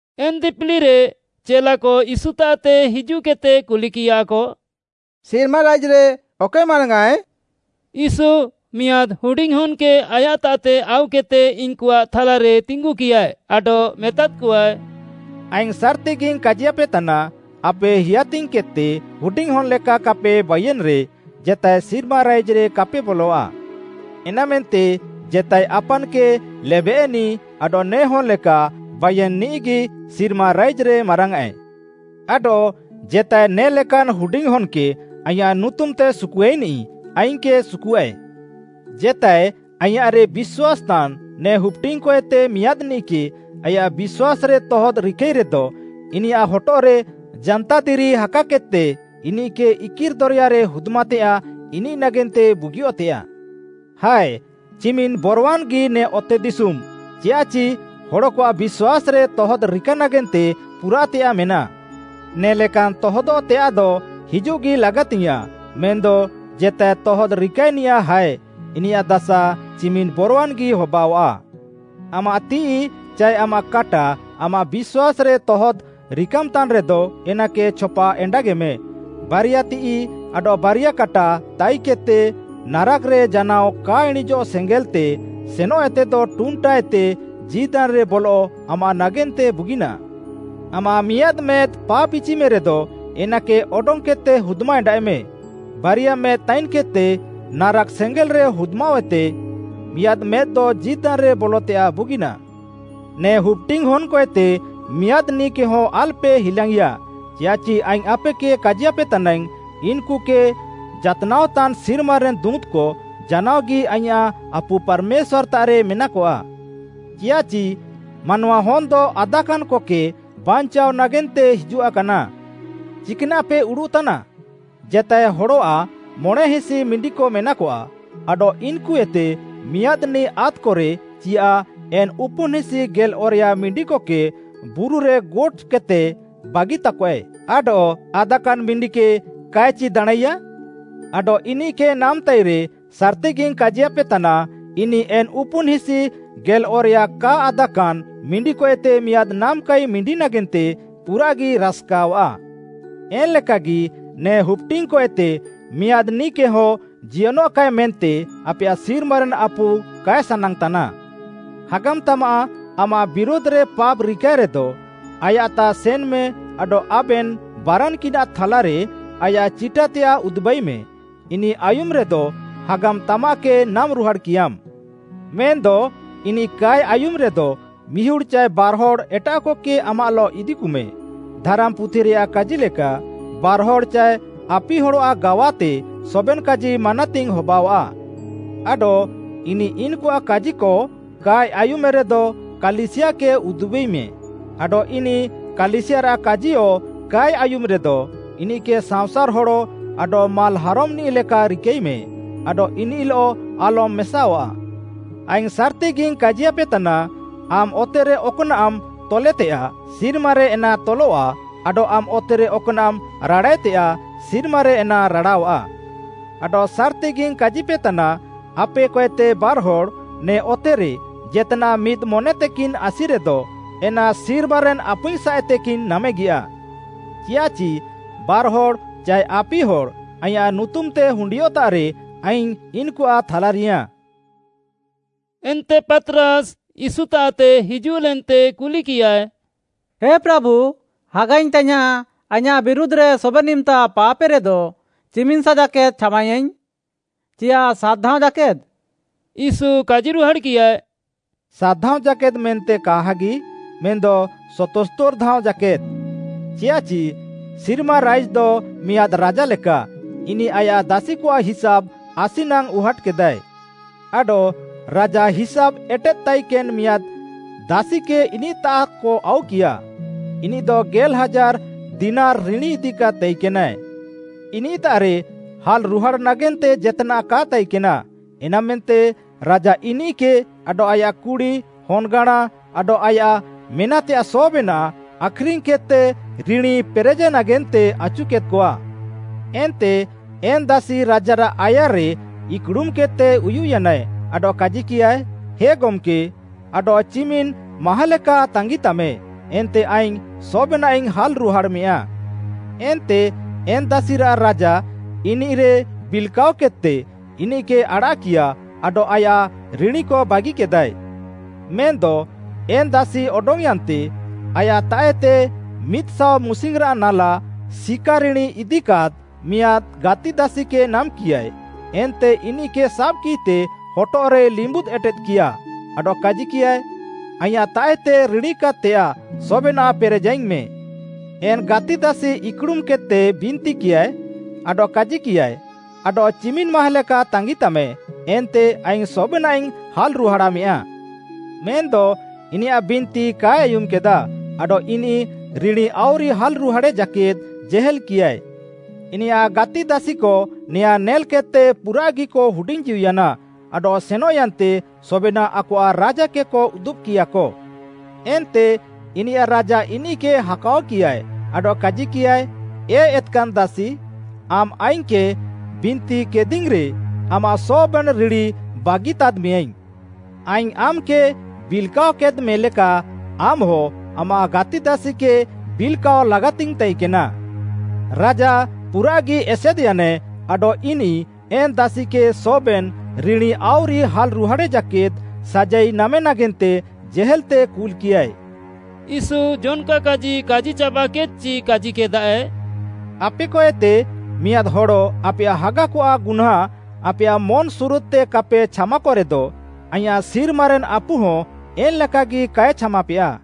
ଏନ୍‌ ଦିପିଲିରେ ଚେଲାକ ୟୀଶୁତାଃତେ ହିଜୁଃକେଦ୍‌ତେ କୁଲିକିୟାକ, “ସିର୍ମା ରାଇଜ୍‌ରେ ଅକଏ ମାରାଙ୍ଗ୍‌ଆଁଏ?” ୟୀଶୁ ମିଆଁଦ୍‌ ହୁଡିଙ୍ଗ୍‌ ହନ୍‌କେ ଆୟାଃତାଃତେ ଆଉକେଦ୍‌ତେ ଇନ୍‌କୁଆଃ ଥାଲାରେ ତିଙ୍ଗୁକିୟାଏ, ଆଡଃ ମେତାଦ୍‌କଆଏ, “ଆଇଙ୍ଗ୍‌ ସାର୍‌ତିଗିଙ୍ଗ୍‌ କାଜିୟାପେତାନା, ‘ଆପେ ହେୟାତିଙ୍ଗ୍‌କେଦ୍‌ତେ ହୁଡିଙ୍ଗ୍‌ହନ୍‌ ଲେକା କାପେ ବାଇୟେନ୍‌ରେ, ଜେତାଏ ସିର୍ମା ରାଇଜ୍‌ରେ କାପେ ବଲଆ। ଏନାମେନ୍ତେ ଜେତାଏ ଆପାନ୍‌କେ ଲେବେୟେନ୍‌ନିଃ ଆଡଃ ନେ ହନ୍‌ ଲେକା ବାଇୟେନ୍‌ନିଃଗି ସିର୍ମା ରାଇଜ୍‌ରେ ମାରାଙ୍ଗ୍‌ଆଁଏ। ଆଡଃ ଜେତାଏ ନେ ଲେକାନ୍‌ ହୁଡିଙ୍ଗ୍‌ ହନ୍‌କେ ଆଇଁୟାଃ ନୁତୁମ୍‌ତେ ସୁକୁଆଇନିଃ ଆଇଙ୍ଗ୍‌କେ ସୁକୁଆଃଏ।’ “ଜେତାଏ ଆଇଁୟାଃରେ ବିଶ୍ୱାସ୍‌ତାନ୍‌ ନେ ହୁପ୍‌ଡିଙ୍ଗ୍‌କଏତେ ମିଆଁଦ୍‌ନିଃକେ ଆୟାଃ ବିଶ୍ୱାସ୍‌ରେ ତହଦ୍‍ରିକାଇରେଦ ଇନିୟାଃ ହଟଃରେ ଜାନ୍ତାଦିରି ହାକାକେଦ୍‌ତେ ଇନିଃକେ ଇକିର୍‌ ଦରେୟାରେ ହୁଦ୍‌ମାତେୟାଃ ଇନିଃ ନାଗେନ୍ତେ ବୁଗିଅଃତେଆଃ। ହାୟ, ଚିମିନ୍‌ ବରୱାନ୍‌ଗି ନେ ଅତେଦିଶୁମ୍‌ ଚିୟାଃଚି ହଡ଼କଆଃ ବିଶ୍ୱାସ୍‌ରେ ତହଦ୍‌ରିକା ନାଗେନ୍ତେ ପୁରାଃତେୟାଃ ମେନାଃ। ନେ ଲେକାନ୍‌ ତହଦଃତେୟାଃଦ ହିଜୁଃଗି ଲାଗାତିଙ୍ଗ୍‌ୟାଁଃ ମେନ୍‌ଦ ଜେତାଏ ତହଦ୍‌ରିକାନିଆଃ ହାୟ, ଇନିୟାଃ ଦାସା ଚିମିନ୍‌ ବରୱାନ୍‌ଗି ହବାଅଆଃ। “ଆମାଃ ତିଃଇ ଚାଏ ଆମାଃ କାଟା ଆମାଃ ବିଶ୍ୱାସ୍‌ରେ ତହଦ୍‍ ରିକାମ୍‌ତାନ୍‌ରେଦ ଏନାକେ ଛପା ଏଣ୍ଡାଗେମେ। ବାରିଆ ତିଃଇ ଆଡଃ ବାରିଆ କାଟା ତାଇକେଦ୍‌ତେ ନାରାକ୍‌ରେ ଜାନାଅ କା ଇଣିଁଜଃ ସେଙ୍ଗେଲ୍‌ତେ ସେନଃଏତେଦ ଟୁଣ୍ଟାୟାନ୍ତେ ଜୀଦାନ୍‌ରେ ବଲଃ ଆମାଃ ନାଗେନ୍ତେ ବୁଗିନାଃ। ଆମାଃ ମିଆଁଦ୍‌ ମେଦ୍‌ ପାପ୍‌ଇଚିମେରେଦ, ଏନାକେ ଅଡଙ୍ଗ୍‌କେଦ୍‌ତେ ହୁଦ୍‌ମାଏଣ୍ଡାଃଏମେ। ବାରିଆ ମେଦ୍‌ ତାଇନ୍‌କେଦ୍‌ତେ ନାରାକ୍‌ ସେଙ୍ଗେଲ୍‌ରେ ହୁଦ୍‌ମାଅଃହେତେ ମିଆଁଦ୍‌ ମେଦ୍‌ତେ ଜୀଦାନ୍‌ରେ ବଲତେୟାଃ ବୁଗିନାଃ। “ନେ ହୁପ୍‌ଡିଙ୍ଗ୍‌ ହନ୍‌କଏତେ ମିଆଁଦ୍‌ନିଃକେହଁ ଆଲ୍‌ପେ ହିଲାଙ୍ଗ୍‌ଇଆ ଚିୟାଃଚି ଆଇଙ୍ଗ୍‌ ଆପେକେ କାଜିପେତାନାଇଙ୍ଗ୍‌, ଇନ୍‌କୁକେ ଜାତ୍‌ନାଅକତାନ୍‌ ସିର୍ମାରେନ୍‌ ଦୁଁତ୍‌କ ଜାନାଅଗି ଆଇଁୟାଃ ଆପୁ ପାର୍‌ମେଶ୍ୱାର୍‌ତାଃରେ ମେନାକଆ। ଚିୟାଃଚି ମାନୱାହନ୍‌ଦ ଆଦାକାନ୍‍କକେ ବାଞ୍ଚାଅ ନାଗେନ୍ତେ ହିଜୁଆକାନା। “ଚିକ୍‌ନାଃପେ ଉଡ଼ୁଃ ତାନା? ଜେତାଏ ହଡ଼ଆଃ ମଣେଁହିସି ମିଣ୍ଡିକ ମେନାକଆ, ଆଡଃ ଇନ୍‌କୁଏତେ ମିଆଁଦ୍‌ନିଃ ଆଦ୍‌କରେ ଚିୟାଃ ଏନ୍‌ ଉପୁନ୍‌ହିସି ଗେଲ୍‌ଅରେୟା ମିଣ୍ଡିକକେ ବୁରୁରେ ଗୋଟ୍‌କେଦ୍‌ତେ ବାଗିତାକଆଏ ଆଡଃ ଆଦାକାନ୍‌ ମିଣ୍ଡିକେ କାଏ ଚି ଦାଣାଁଁଇୟାଁ? ଆଡଃ ଇନିଃକେ ନାମ୍‌ତାଇରେ, ସାର୍‌ତିଗିଙ୍ଗ୍‌ କାଜିୟାପେତାନା, ଇନିଃ ଏନ୍‌ ଉପୁନ୍‌ହିସି ଗେଲ୍‌ଅରେୟା କା ଆଦାକାନ୍‌ ମିଣ୍ଡିକଏତେ ମିଆଁଦ୍‌ ନାମାକାଇ ମିଣ୍ଡି ନାଗେନ୍ତେ ପୁରାଃଗି ରାସ୍‌କାଅଃଆ। ଏନ୍‌ଲେକାଗି ନେ ହୁପ୍‌ଡିଙ୍ଗ୍‌କଏତେ ମିଆଁଦ୍‌ନିଃକେହଁ ଜିୟନଃକାଏ ମେନ୍ତେ ଆପେୟାଃ ସିର୍ମାରେନ୍‌ ଆପୁ କାଏ ସାନାଙ୍ଗ୍‌ତାନା। “ହାଗାମ୍‌ତାମାଃ ଆମାଃ ବିରୁଧ୍‌ରେ ପାପ୍‌ ରିକାଏରେଦ, ଆୟାଃତାଃ ସେନ୍‌ମେ ଆଡଃ ଆବେନ୍‌ ବାରାନ୍‌କିନାଃ ଥାଲାରେ ଆୟାଃ ଚିଟାତେୟାଃ ଉଦୁବାଇମେ। ଇନିଃ ଆୟୁମ୍‌ରେଦ ହାଗାମ୍‌ତାମାଃକେ ନାମ୍‌ରୁହାଡ଼୍‌କିୟାମ୍‌। ମେନ୍‌ଦ ଇନିଃ କାଏ ଆୟୁମ୍‌ରେଦ ମିହୁଡ଼୍‌ ଚାଏ ବାର୍‌ହଡ଼୍‌ ଏଟାଃକକେ ଆମାଃଲଃ ଇଦିକୁମେ। ଧାରାମ୍‌ପୁଥିରେୟାଃ କାଜିଲେକା, ‘ବାର୍‌ହଡ଼୍‌ ଚାଏ ଆପିହଡ଼୍‌ଆଃ ଗାୱାତେ ସବେନ୍‌ କାଜି ମାନାତିଙ୍ଗ୍‌ ହବାଅଃଆ।’ ଆଡଃ ଇନିଃ ଇନ୍‌କୁଆଃ କାଜିକ କାଏ ଆୟୁମ୍‌ରେଦ କାଲିସିୟାକେ ଉଦ୍‍ବିମେ, ଆଡଃ ଇନିଃ କାଲିସିୟାରାଃ କାଜିୟ କାଏ ଆୟୁମ୍‌ରେଦ, ଇନିଃକେ ସାଅଁସାର୍‌ ହଡ଼ ଆଡଃ ମାଲ୍‌ହାରମ୍‌ନିଃ ଲେକା ରିକାଇମେ, ଆଡଃ ଇନିଃଲଃ ଆଲମ୍‌ ମେସାଅଃଆ। “ଆଇଙ୍ଗ୍‌ ସାର୍‌ତିଗିଙ୍ଗ୍‌ କାଜିୟାପେତାନା, ଆମ୍‌ ଅତେରେ ଅକ୍‌ନାଃମ୍‌ ତଲେତେୟାଃ, ସିର୍ମାରେ ଏନା ତଲଃଆ, ଆଡଃ ଆମ୍‌ ଅତେରେ ଅକ୍‌ନାଃମ୍‌ ରାଡ଼ାଏତେୟାଃ, ସିର୍ମାରେ ଏନା ରାଡ଼ାଅଃଆ। “ଆଡଃ ସାର୍‌ତିଗିଙ୍ଗ୍‌ କାଜିପେତାନା, ଆପେକଏତେ ବାର୍‌ହଡ଼୍‌ ନେ ଅତେରେ ଜେତ୍‌ନାଃ ମିଦ୍‌ ମନ୍‍ତେକିନ୍‌ ଆସିରେଦ, ଏନା ସିର୍ମାରେନ୍‌ ଆପୁଇଙ୍ଗ୍‌ ସାଃଏତେକିନ୍‌ ନାମେଗିୟା। ଚିୟାଃଚି ବାର୍‌ହଡ଼୍‌ ଚାଏ ଆପିହଡ଼୍‌ ଆଇଁୟାଃ ନୁତୁମ୍‌ତେ ହୁଣ୍ଡିୟଃତାଃରେ ଆଇଙ୍ଗ୍‌ ଇନ୍‌କୁଆଃ ଥାଲାରିୟାଁଃ।” ଏନ୍ତେ ପାତ୍‌ରାସ୍‌ ୟୀଶୁତାଃତେ ହିଜୁଃଲେନ୍ତେ କୁଲିକିୟାଏ, “ହେ ପ୍ରାଭୁ, ହାଗାଇଙ୍ଗ୍‌ ତାଇୟାଁଃ ଆଇଁୟାଃ ବିରୁଧ୍‌ରେ ସବେନ୍‌ ଇମ୍‌ତା ପାପ୍‌ଏରେଦ ଚିମିନ୍‌ସା ଜାକେଦ୍‌ ଛାମାଇୟାଇଙ୍ଗ୍‌? ଚିୟାଃ ସାତ୍‌ ଧାଅଁ ଜାକେଦ୍‌?” ୟୀଶୁ କାଜିରୁହାଡ଼୍‌କିୟାଏ, “ସାତ୍‌ ଧାଅଁ ଜାକେଦ୍‌ ମେନ୍ତେ କାହାଗି, ମେନ୍‌ଦ ସତସ୍ତୋର୍‌ ଧାଅଁ ଜାକେଦ୍‌? ଚିୟାଃଚି ସିର୍ମା ରାଇଜ୍‌ଦ ମିଆଁଦ୍‌ ରାଜାଲେକା, ଇନିଃ ଆୟାଃ ଦାସିକଆଃ ହିସାବ୍‌ ଆସି ନାଙ୍ଗ୍‌ ଉହାଟ୍‌କେଦାଏ। ଆଡଃ ରାଜା ହିସାବ୍‌ ଏଟେଦ୍‌ତାଇକେନ୍‌ ଇମ୍‌ତା ମିଆଁଦ୍‌ ଦାସିକେ ଇନିଃତାଃକ ଆଉକିୟା, ଇନିଃଦ ଗେଲ୍‌ ହାଜାର୍‌ ଦିନାରି ରିଣୀ ଇଦିକାଦ୍‌ ତାଇକେନା। ଇନିଃତାଃରେ ହାଲ୍‍ରୁହାଡ଼୍‌ ନାଗେନ୍ତେ ଜେତ୍‌ନାଃ କା ତାଇକେନା। ଏନାମେନ୍ତେ ରାଜା ଇନିଃକେ ଆଡଃ ଆୟାଃ କୁଡ଼ି, ହନ୍‌ଗାଁଣା, ଆଡଃ ଆୟାଃ ମେନାଃତେୟାଃ ସବେନାଃ ଆଖ୍‌ରିଙ୍ଗ୍‌କେଦ୍‌ତେ ରିଣୀ ପେରେଃ ନାଗେନ୍ତେ ଆଚୁକେଦ୍‌କଆ। ଏନ୍ତେ ଏନ୍‌ ଦାସି ରାଜାରାଃ ଆୟାର୍‌ରେ ଇକ୍‌ଡ଼ୁମ୍‌କେଦ୍‌ତେ ଉୟୁଃୟାନାଏ, ଆଡଃ କାଜିକିୟାଏ, ‘ହେ ଗମ୍‌କେ, ଆଡଃ ଚିମିନ୍‌ ମାହାଁଲେକା ତାଙ୍ଗିତାମେ, ଏନ୍ତେ ଆଇଙ୍ଗ୍‌ ସବେନାଃଇଙ୍ଗ୍‌ ହାଲ୍‌ରୁହାଡ଼ାମେଆ।’ ଏନ୍ତେ ଏନ୍‌ ଦାସିରାଃ ରାଜା ଇନିଃରେ ବିଲ୍‌କାଅକେଦ୍‌ତେ, ଇନିଃକେ ଆଡ଼ାଃକିୟା, ଆଡଃ ଆୟାଃ ରିଣୀକ ବାଗିକେଦାଏ। “ମେନ୍‌ଦ ଏନ୍‍ ଦାସି ଅଡଙ୍ଗ୍‌ୟାନ୍‌ତେ, ଆୟାଃତାଃଏତେ ମିଦ୍‌ ସାଅ ମୁସିଙ୍ଗ୍‌ରାଃ ନାଲା ସିକା ରିଣୀ ଇଦିକାଦ୍‌ ମିଆଁଦ୍‌ ଗାତିଦାସିକେ ନାମ୍‍କିୟାଏ, ଏନ୍ତେ ଇନିଃକେ ସାବ୍‌କିତେ ହଟଃରେ ଲିମ୍ବୁଦ୍‍ ଏଟେଦ୍‌କିୟା ଆଡଃ କାଜିକିୟାଏ, ‘ଆଇଁୟାଃତାଃଏତେ ରିଣୀକାଦ୍‌ତେୟାଃ ସବେନାଃ ପେରେଜାଇଙ୍ଗ୍‌ମେ।’ ଏନ୍‌ ଗାତିଦାସି ଇକ୍‌ଡ଼ୁମ୍‌କେଦ୍‌ତେ ବିନ୍ତିକିୟାଏ, ଆଡଃ କାଜିକିୟାଏ, ‘ଆଡଃ ଚିମିନ୍‌ ମାହାଁଲେକା ତାଙ୍ଗିତାମେ, ଏନ୍ତେ ଆଇଙ୍ଗ୍‌ ସବେନାଃଇଙ୍ଗ୍‌ ହାଲ୍‌ରୁହାଡ଼ାମେଆ।’ ମେନ୍‌ଦ ଇନିୟାଃ ବିନ୍ତି କାଏ ଆୟୁମ୍‌କେଦା, ଆଡଃ ଇନିଃ ରିଣୀ ଆଉରି ହାଲ୍‌ରୁହାଡ଼େ ଜାକେଦ୍‌ ଜେହେଲ୍‌କିୟାଏ। ଇନିୟାଃ ଗାତିଦାସିକ ନେଆଁଁ ନେଲ୍‍କେଦ୍‍ତେ ପୁରାଃଗିକ ହୁଡିଙ୍ଗ୍‌ଜୀଉୟାନା ଆଡଃ ସେନଃୟାନ୍ତେ ସବେନାଃ ଆକଆଃ ରାଜାକେକ ଉଦୁବ୍‌କିୟାକ। ଏନ୍ତେ ଇନିୟାଃ ରାଜା ଇନିଃକେ ହାକାଅକିୟାଏ, ଆଡଃ କାଜିକିୟାଏ, ‘ଏ ଏତ୍‌କାନ୍‌ ଦାସି, ଆମ୍‌ ଆଇଙ୍ଗ୍‌କେ ବିନ୍ତିକେଦିଇଙ୍ଗ୍‌ରେ ଆମାଃ ସବେନ୍‌ ରିଣୀ ବାଗିତାଦ୍‌ମେୟାଁଇଙ୍ଗ୍‌। ଆଇଙ୍ଗ୍‌ ଆମ୍‌କେ ବିଲ୍‍କାଅକେଦ୍‌ମେଲେକା, ଆମ୍‌ହ ଆମାଃ ଗାତିଦାସିକେ ବିଲ୍‌କାଅ ଲାଗାତିଙ୍ଗ୍‌ ତାଇକେନା।’ ରାଜା ପୁରାଃଗି ଏସେଦ୍‌ୟାନାଏ ଆଡଃ ଇନିଃ ଏନ୍‌ ଦାସିକେ ସବେନ୍‌ ରିଣୀ ଆଉରି ହାଲ୍‌ରୁହାଡ଼େ ଜାକେଦ୍‌ ସାଜାଇ ନାମେ ନାଗେନ୍ତେ ଜେହେଲ୍‌ତେ କୁଲ୍‌କିୟାଏ।” ୟୀଶୁ ଜନ୍‌କା କାଜି କାଜିଚାବାକେଦ୍‌ଚି କାଜିକେଦାଏ, “ଆପେକଏତେ ମିଆଁଦ୍‌ ହଡ଼ ଆପେୟାଃ ହାଗାକଆଃ ଗୁହ୍ନାଁ ଆପେୟାଃ ମନ୍‌ସୁରୁଦ୍‌ତେ କାପେ ଛାମାକରେଦ, ଆଇଁୟାଃ ସିର୍ମାରେନ୍‌ ଆପୁହଁ ଏନ୍‌ଲେକାଗି କାଏ ଛାମାପେୟା।”